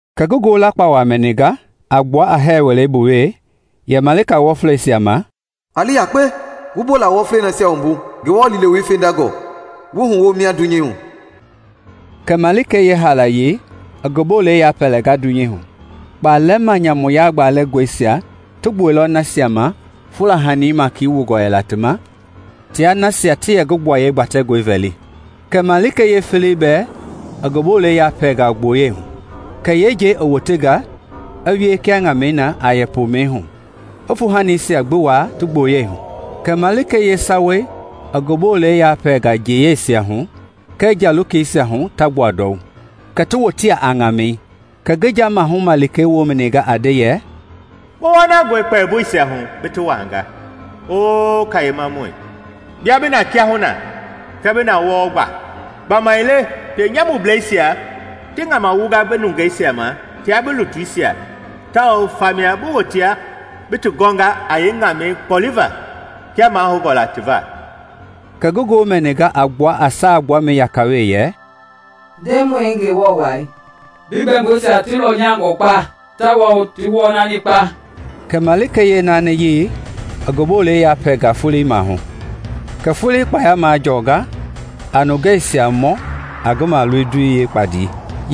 Kɛ ngi ngoo lakpawa mɛninga a gbua a hɛɛ wɛleibu we yɛ malika wɔfleisia ma, “A li yakpe wu bola wɔflei nasia wumbu Ngewɔ liilewei fendangɔ wu huwo mia dunyei hu!” Kɛ malikei yeehaalayei i ngi bolei yapɛɛnga dunyei hu. Kpalɛma nyamu yagbalɛngɔisia ti gbuɛilɔ nasia ma fula huɛi maiki wungɔ yɛla ti ma tia nasia ti yɛ ngi gbuaye gbatɛngɔi vɛli. Kɛ malikei yeefeleyei bɛɛ i ngi bolɛi yapɛɛnga gboyei hu. Kɛ yeenjei i wotenga i wie kia ŋamɛi na a yɛ poomɛi hu, i fuuhanisia gbi ti waa ti boyei hu. Kɛ malikei yeesawayei i ngi bolɛi yapɛɛnga njei yeisia hu kɛɛ nja lokeisia hu ta gbua ndɔu, kɛ ti wotea a ŋamɛi. Kɛ ngi nja maahu malikei woo mɛninga a nde yɛ, “Bi wɔnangɔi kpɛmboisia hu bi ti wuaanga, O Kayemamɔi, bia bi na kiahuna kɛɛ bi na wɔɔ gba! Gbamaile pienyamubleisia ti ŋama wunga bi nungeisia ma tia bi lutuisia tao famia bi wotea bi ti gɔnga a yeeŋamɛi kpoliva kia mahoungɔ la ti va.” Kɛ ngi ngoo mɛninga a gbua a saa gbuamɛi yaka we yɛ, “Ndemɔi Ngewɔ Wa! Bi gbɛmboisia ti lɔnyangɔ kpa tawao ti wɔnani kpa!” Kɛ malikei yeenaaniyei ngi bolei yapɛlɛnga foloi maahu, kɛ foloi kpaya majɔnga a nungeisia mɔ a ngi maloindoi gbandii.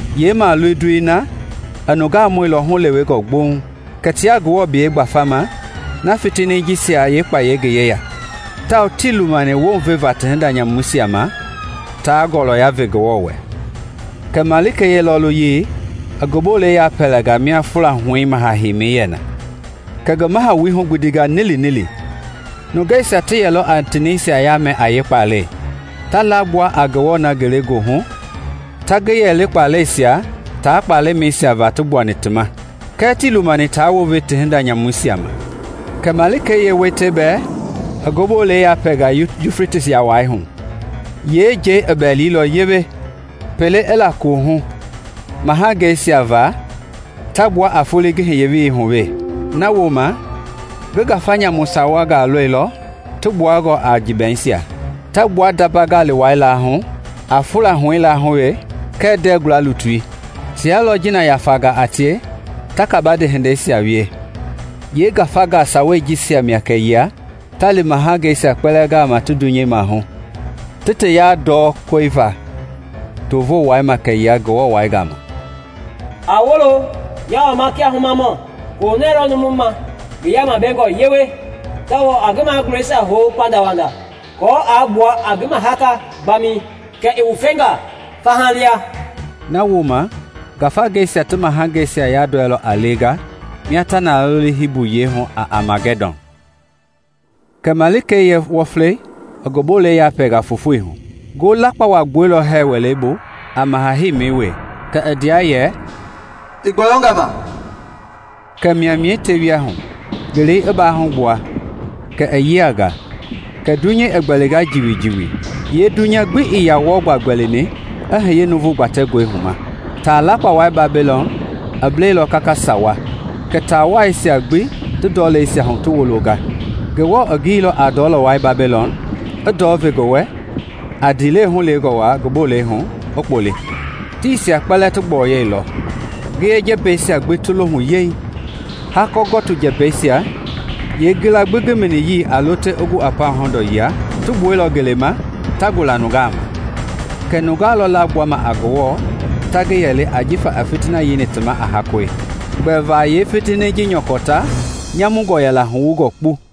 Yeemaloindoi na i nungaa mɔilɔ hulewengɔ gboŋ kɛ tia Ngewɔ biyei gbafama na fitini jisia yeekpayei ngi yeya, tawao tii lumani wounve va ti hinda nyamuisia ma taa ngɔlɔya ve Ngewɔ wɛ. Kɛ malikei yeelɔɔluyei i ngi bolei yapɛlɛnga mia fula huɛi maha heimi yɛ na, kɛ ngi mahawui hugbindinga nilinili; nungeisia ti yɛlɔ a ti nɛisia yamɛ a yeekpalɛi, ta lagbua a Ngewɔ na ngelegoohu ta ngi yɛli kpalɛisia taa kpalɛmɛisia va ti gbuani ti ma. Kɛɛ tii lumani ta wounve ti hinda nyamuisia ma. Kɛ malikei yeeweitayei bɛɛ i ngi bolei yapɛlɛnga Yufletisi yawai hu. Yeenjei i bɛlilɔ yewe pelei i la kohu mahangeisia va ta gbua a foloi ngi hiye welei hu we. Nawooma ngi ngafa nyamu sawangaa lɔilɔ ti gbuangɔ a jiibɛisia, ta gbua ndamba gali wai lahu, a fula huɛi lahu we kɛɛ ndɛɛguala lutui. Tia lɔ jiina yafangaa a tie ta kabande hindeisia wie. Yeengafa sawei jisia mia kɛyia ta li mahangeisia kpɛlɛɛ gama ti dunyei maahu ti ti yandɔɔ koe va too voo wai ma kɛyila Ngewɔ wa gama. “A woolo! Nyaa wama kia humamɔ! Koohunɛɛ lɔ numui ma ngi yaama bengɔ yewe tawao a ngi magulɛisia hou pandawanda, aako aa gbua a ngi mahaka gbamɛi kɛ i wufenga faha lia!” Nawooma ngafangeisia ti mahangeisia yandɔilɔ a lenga mia ta toli Hibu yiɛi hu a Amagɛdɔn. Kɛ malikei yeewɔflei i ngi bolei yapɛlɛnga fofoi hu. Ngo lakpawa i gbuɛilɔ hɛɛ wɛleibu a maha heimi we, kɛ i ndea yɛ, “I gbɔyɔnga ma!” Kɛ maimai tewia hu, ngelei i baahugbua kɛ i yianga, kɛ dunyei gbɛlinga jiwijiwi. Yee dunya gbii yaa wɔɔ gbaa gbɛlini i hiye nuuvu gbatɛngɔi hu ma! Taa lakpawai Babilɔn i blailɔ kaka sawa, kɛ taawaisia gbi ti ndɔleisia hu ti wolonga. Ngewɔ i gililɔ a ndɔlɔwai Babilɔn i ndɔɔ ve ngi wɛ a ndiilewe hulewengɔ wa ngi bolei hu i kpoli. Tiisia kpɛlɛɛ ti gbɔyɔilɔ, ngiye jɛmbɛisia gbi ti lohu yeeŋ. Hakɔ gɔtii jɛmbɛisia, yeengila gbi ngi miniyii a lo te i gu a pauŋ hɔndɔ yila, ti gbuɛilɔ ngeleima ta gula nungaa ma. Kɛ nungeisia lɔ lagbuama a Ngewɔ ta ngi yɛli jifa i fitina yeini ti ma a hakɔi, gbɛva yeefitini ji nyɔkɔ ta nyamungɔ yɛla huwungɔ kpu.